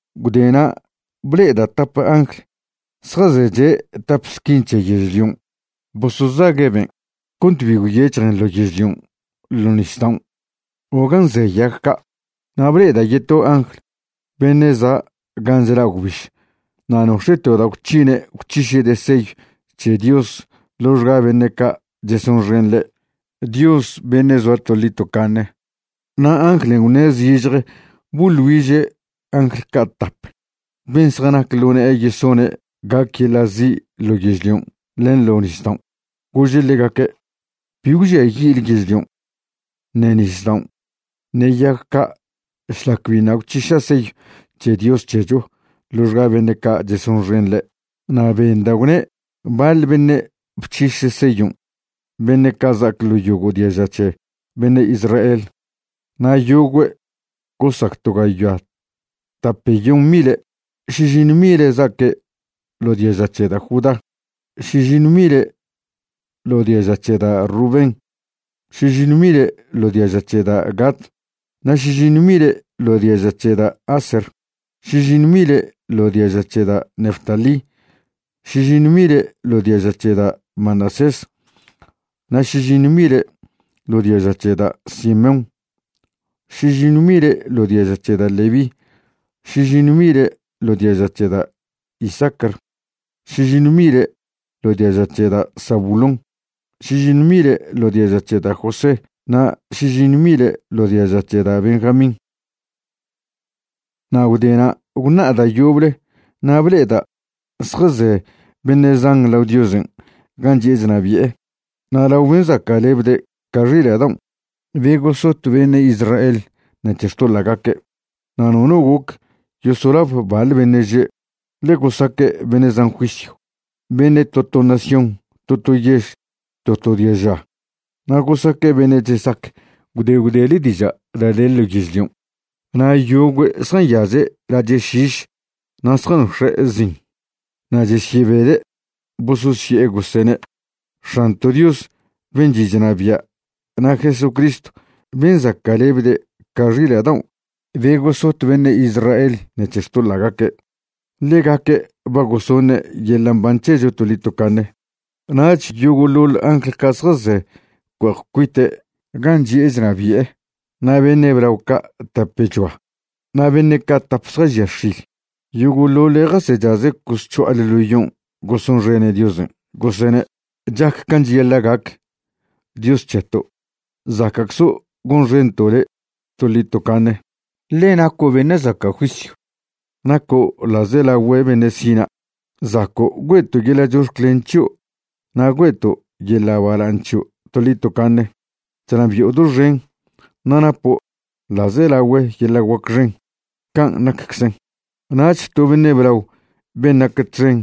Gwdena' ble'eda' tap angl zjazeche' tap squin c̱he yežlion' bosozague' ben' cont bi gwyec̱hjen ḻo yežlion', ḻo nisdaon' o gan' ze yag ca'. Na' ble'eda' yeto angl beṉe' za' gan' chla' gwbiž na' nox̱e' to da' gwc̱hine' gwc̱hiše'de' seyw c̱he Dios ḻoxga beṉe' ca' chesonxen ḻe', Dios beṉe' zoa toḻi tocaṉe. Na' anglen' gwṉe' zižje boḻ güiže' angl ca' tap ben' zjanac ḻo ne'e yesone' gac yeḻa' zi' ḻo yežlion' len ḻo nisdaon'. Gože' ḻegaque': ―Bi gwžiayi'le yežlion', ṉe nisdaon', ṉe yag ca' šlac biṉa' gwc̱hiša' seyw c̱he Dios c̱hecho ḻoxga beṉe' ca' chesonxen ḻe'. Na' benda' gwne' baḻ beṉe' bc̱hiše' seyon' beṉe' za'ac ḻo yogo' diaža c̱he beṉe' Israel, na' yogüe' gosac to gayoa tapeyon mile'. Šižiṉw mile' za'aque' ḻo diaža c̱he da' Judá, šižiṉw mile' ḻo diaža c̱he da' Rubén, šižiṉw mile' ḻo diaža c̱he da' Gad, na' šižiṉw mile' ḻo diaža c̱he da' Aser, šižiṉw mile' ḻo diaža c̱he da' Neftalí, šižiṉw mile' ḻo diaža c̱he da' Manasés, na' šižiṉw mile' ḻo diaža c̱he da' Simeón, šižiṉw mile' ḻo diaža c̱he da' Leví, šižiṉw mile' ḻo diaža c̱he da' Isacar, šižiṉw mile' ḻo diaža c̱he da' Zabulón, šižiṉw mile' ḻo diaža c̱he da' José na' šižiṉw mile' ḻo diaža c̱he da' Benjamín. Na' gwdena' gwṉa'a da' yoble na' ble'eda' zjaze beṉe' zan lao Diosen' gan' chi'e chnabi'e na' lao ben' zaca'lebde' ca xila' daon' be gosot beṉe' Israel ṉec̱he xtoḻa'gaque'. Na' nono goc yosolab baḻ beṉe' že', ḻe gosaque' beṉe' zan juisyw, beṉe' to to nación, to to yež, to to diaža, na' gosaque' beṉe' chesac gwde gwdele diža' da' de ḻo yezlion'. Na' yogüe' zjanyaze' lache' šiš na' zjanox̱e' zin. Na' chesyebede' bososye'e gosene': X̱anto' Dios ben' chi' chnabia' na' Jesucristw ben' zaca'lebde' ca xila' daon' be gosot beṉe' Israel ṉec̱he xtoḻa'gaque', ḻegaque' ba gosoṉe' yeḻa' mban c̱hecho toḻi tocaṉe. Nach yogo'ḻoḻ angl ca' zjaze' cue'ej cuite' gan' chi'e chnabi'e, na' beṉe' blao ca' tapechoa na' beṉe' ca' tap zjažia x̱il, yogo'ḻoḻe' jasechaze' cosc̱ho'ale ḻo yon' gosonxene' Diosen', gosene': Chac can' cheyaḻa' gac, Dios c̱heto'. Zaca'czo' gonxento' le' toḻi tocaṉe, ḻe naco' beṉe' zaca' juisyw, naco' ḻa'zelagüe beṉe' sina', zaco' güe'to' yeḻa' chox̱clen c̱hio' na' güe'to' yeḻa' bala'aṉ c̱hio' toḻi tocaṉe, chnabi'o doxen, na' napo' ḻa'zelagüe yeḻa' guac xen. Can' nacczen. Nach to beṉe' blao ben' nac txen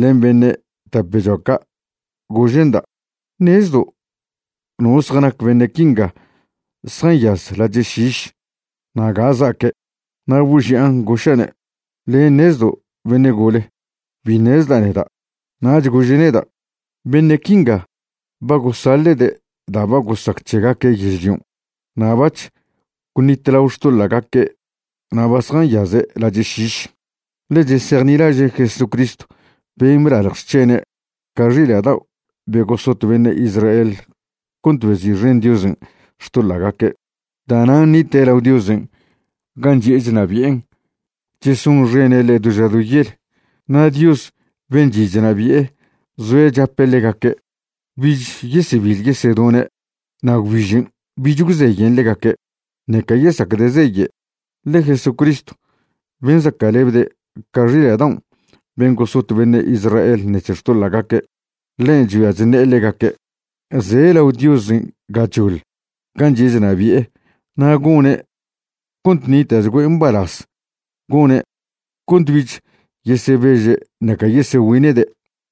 len beṉe' tapechoa ca' gože'nda': ―¿Ṉezdo' no zjanac beṉe' quinga zjanyaz lache' šiš na' ga za'aque'? Na' boži'an goša'ne': ―Le' ṉezdo' beṉe' gole, bi ṉezda' neda'. Nach gože' neda': ―Beṉe' quinga ba gosaḻe'de' da' ba gosac c̱hegaque' yežlion'. Na' bac̱h gwnitlao xtoḻa'gaque' na' ba zjanyaze' lache' šiš, ḻe chesejnilaže' Jesucristw ben' blalj xc̱hene' ca xila' dao' be gosot beṉe' Israel cont bezi'xen Diosen' xtoḻa'gaque'. Da'nan' nite' lao Diosen' gan' chi'e chnabi'en chesonxene' ḻe' do ža do yel. Na' Dios ben' chi' chnabi'e zoe' chape' ḻegaque'. Bich yesebiḻ yesedone', na' gwbižen' bich gwzeyen ḻegaque', ṉeca yesacde' zeye'. Ḻe Jesucristw ben' zaca'lebde' ca xila' daon' ben' gosot beṉe' Israel ṉec̱he xtoḻa'gaque', ḻen' chgüia chṉe'e ḻegaque'. Ze' lao Diosen' gachoḻ gan' chi'e chnabi'e na' gone' cont ṉita'chgüe' mbalaz. Gone' cont bich yesebeže' ṉeca yesegüine'de'.